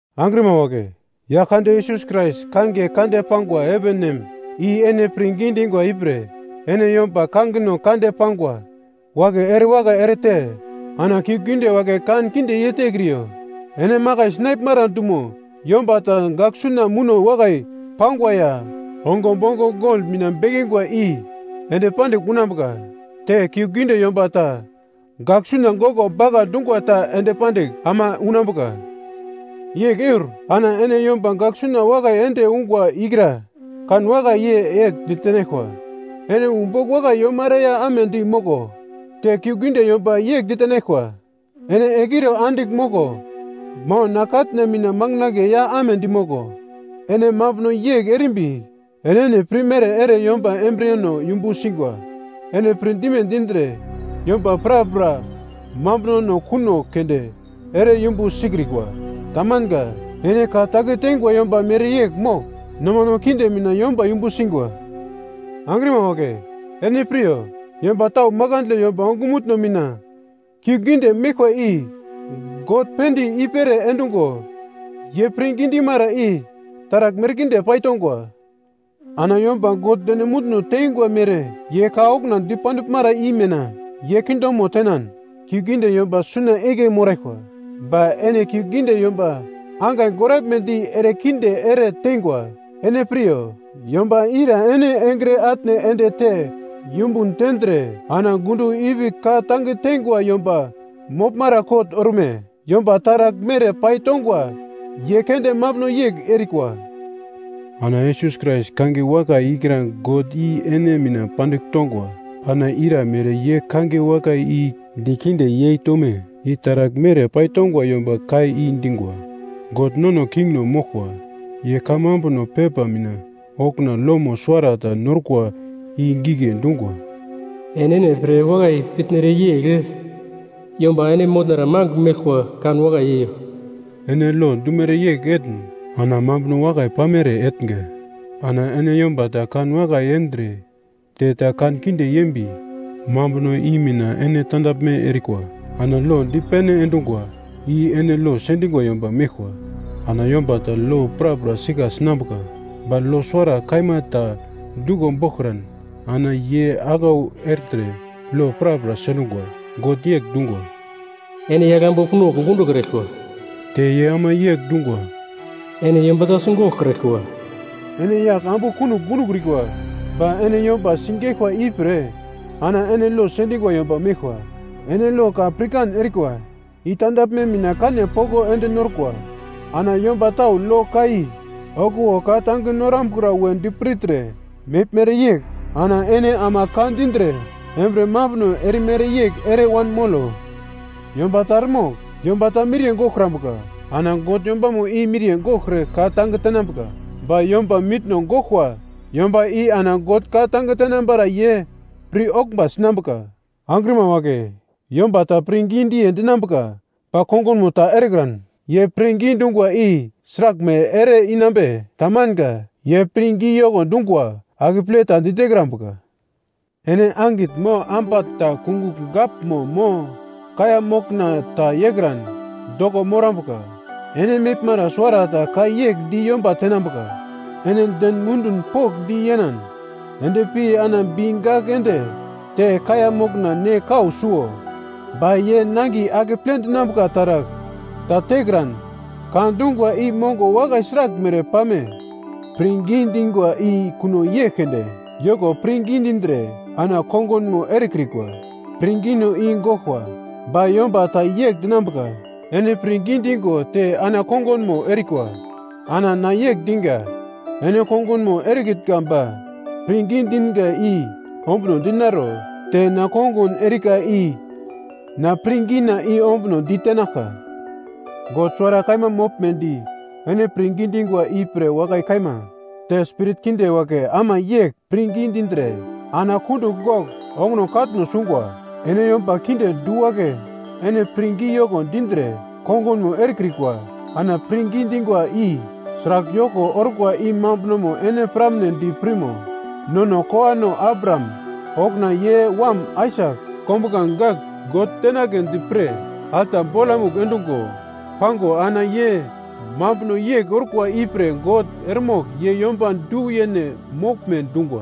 Angrima wagle, Yaglkande Yesus Krais kangiye kande pangwa heven nem i ene pirngi dingwa ipre ene yomba kangino kande pangwa wagle erewakai erete ana kiuglgiunde wagle kankinde yeitekriyo. Ene makai sinaglmara dumo yomba ta gaglsuna muno wakai pangwa ya ongo bomgo gol mina bekingwa i ende pandigl unambuka, te kiuglgiunde yomba ta gaglsuna goglo bagla dungwa ta ende pandigl ama unambuka. Yegl eur ana ene yomba gaglsuna wakai ende ungwa ikra kanwakai yei yegl ditenaglkwa, “Ene wu bogl wakai yomara ya amedi moglo.” Te kiuglgiunde yomba yegl ditenaglkwa, “Ene egliro andigl moglo, mo na katna mina manginagle ya amedi moglo.” Ene mambuno yegl erimbi, enene pirmere ere yomba embriyeno yumbu singwa. Ene pirdime dindre yomba prapra mambuno kuno keunde ere yumbu sikrikwa. Tamanga. Ene ka tange teingwa yomba mereyegl mogl nomano kinde mina yomba yumbu singwa. Angrima wagle, ene piryo yomba tau makandle yomba ongumutno mina kiuglgiunde meglkwa i God pinde i-pere endungo, ye pirngi dimara i taragl merkinde paitongwa. Ana yomba God deno munduno teingwa mere ye ka okuna dipandiglmara i mina ye kingdomo tenan kiuglgiunde yomba suna igle moraglkwa. Ba ene kiuglgiunde yomba angai goraglmedi erekinde ere teingwa, ene piryo, yomba ira ene engre atne endete yumbun tendre ana gundo ipi ka tange teingwa yomba moglmara kot orme? Yomba taragl mere pai tongwa ye keunde mambuno yegl erikwa. Ana Yesus Krais kangiye wakai ikra God i ene mina pandigl tongwa. Ana ira mere ye kangiye wakai i dikinde yeitome? I taragl mere paitongwa yomba ka i dingwa. God nono kingno moglkwa, ye kamambuno pepa mina okuna lomo suwarata norkwa i gigle dungwa, “Enene pre wakai pitnere yegl yomba ene motnara magl meglkwa kanwakai yeiyo.” Ene lo dumere yegl etne ana mambuno wakai pamere etnga. Ana ene yomba ta kanwakai yendre te ta kankinde yembi mambuno i mina ene tandaglme erikwa. Ana lo dipene endungwa i ene lo sendingwa yomba meglkwa. Ana yomba ta lo prapra sika sinambuka ba lo suwara kaima ta duglo boglkran, ana ye aglau ertre lo prapra sendungwa. God yegl dungwa, “Ene yagl ambu kunogl gundokraglkwa.” Te ye ama yegl dungwa, “Ene yomba ta sigoglkraglkwa.” Ene yagl ambu kunogl gundokrikwa ba ene yomba sigeglkwa ipre ana ene lo sendingwa yomba meglkwa. Ene lo ka pirkan erikwa i tandaglme mina kane poko ende norkwa. Ana yomba tau lo ka i okuwo ka tange norambukra wondi pirtre meglmere yegl, ana ene ama ka dindre embriye mambuno erimere yegl ere wanmolo. Yomba ta eremogl yomba ta miriye goglkrambuka. Ana God yombamo i miriye goglkre ka-tange tenambuka. Ba yomba mitno goglkwa yomba i ana God ka-tange tenambara ye pir oglmba sinambuka. Angrima wagle, yomba ta pirngi diye dinambuka ba kongunmo ta erekran, ye pirngi dungwa i sraglmere ere-inambe? Tamanga, ye pirngi yoko dungwa akeple ta ditekrambuka. Ene angitn mo ambatn ta kungugl gaglmo mo kaiya mokna ta yeikran doko morambuka. Ene meglmara suwarata ka yegl di yomba tenambuka, “Ene den mundun pokndi yenan endpi ana bi gagl ende te kaiya mokna ne kau suo,” ba ye nangiye akeple dinambuka taragl ta tekran, ka dungwa i mongo wakai sraglmere pame? Pirngi dingwa i kuno yegl keunde, yoko pirngi dindre ana kongunmo erekrikwa, pirngino i goglkwa. Ba yomba ta yegl dinambuka, “Ene pirngi dingo te na kongunmo erikwa.” Ana na yegl diga, “Ene kongunmo erekitnga ba pirngi dinga i ombuno dinaro, te na kongun erika i na pirngina ombuno di tenaglka.” God suwara kaima moglmedi ene pirngi dingwa ipre wakai kaima. Te spirit kinde wagle ama yegl pirngi dindre, ana kundugl gogl onguno katno sungwa. Ene yomba kinde du wagle, ene pirngi yoko dindre kongunmo erekrikwa ana pirngi dingwa i sragl yoko orkwa i mambunomo ene piramnedi pirmo? Nono kowano Abraham okuna ye wam Aisak kombuglange gagl God tenagledi pre alta bolamugl endungo, pango ana ye mambuno yegl orkwa ipre God eremogl ye yomba du-yene moglme dungwa.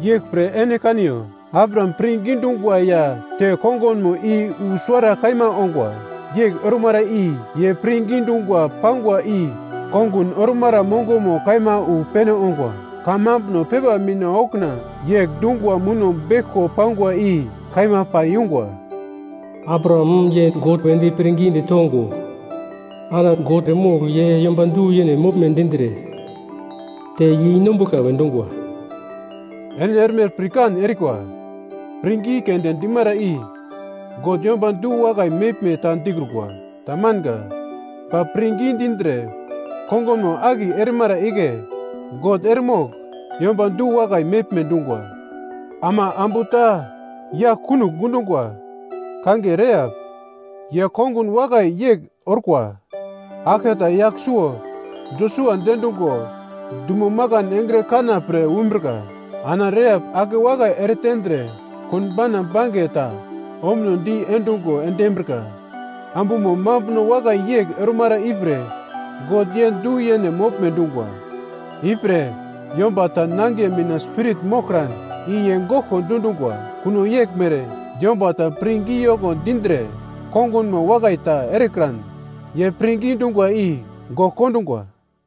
Yeglpre ene kaniyo, Abraham pirngi dungwa ya te kongunmo i wu suwara kaima ongwa, yegl ormara i ye pirngi dungwa pangwa i kongun ormara mongomo kaima wu pene ongwa. Kamambuno pepa mina okuna yegl dungwa muno beglko pangwa i kaima pai yungwa, “Abraham ye God wedi pirngidi tongo ana God eremogl ye yomba du-yene moglme dindre te yeinombuglka we dungwa.” Ene erme pirkan erikwa pirngi keunde dimara i God yomba du-wakai meglme ta dikrukwa, tamanga. Ba pirngi dindre kongunmo akiye erimara igle God eremogl yomba du-wakai meglme dungwa. Ama ambu ta yagl kunogl gundungwa kangiye Rehap. Ye kongun wakai yegl orkwa. Aglketa yagl suwo Josua diendungo dumo makan engre kana pre umbrika. Ana Rehap akewakai eretendre konbauna bange ta ombuno di endungo endimbrika. Ambumo mambuno wakai yegl ormara ipre God ye du-yene moglme dungwa. Ipre, yomba ta nangiye mina spirit moglkran i ye goglko dundungwa. Kuno yeglmere yomba ta pirngi yoko dindre kongunmo wakai ta erekran ye pirngi dungwa i gogl kondungwa.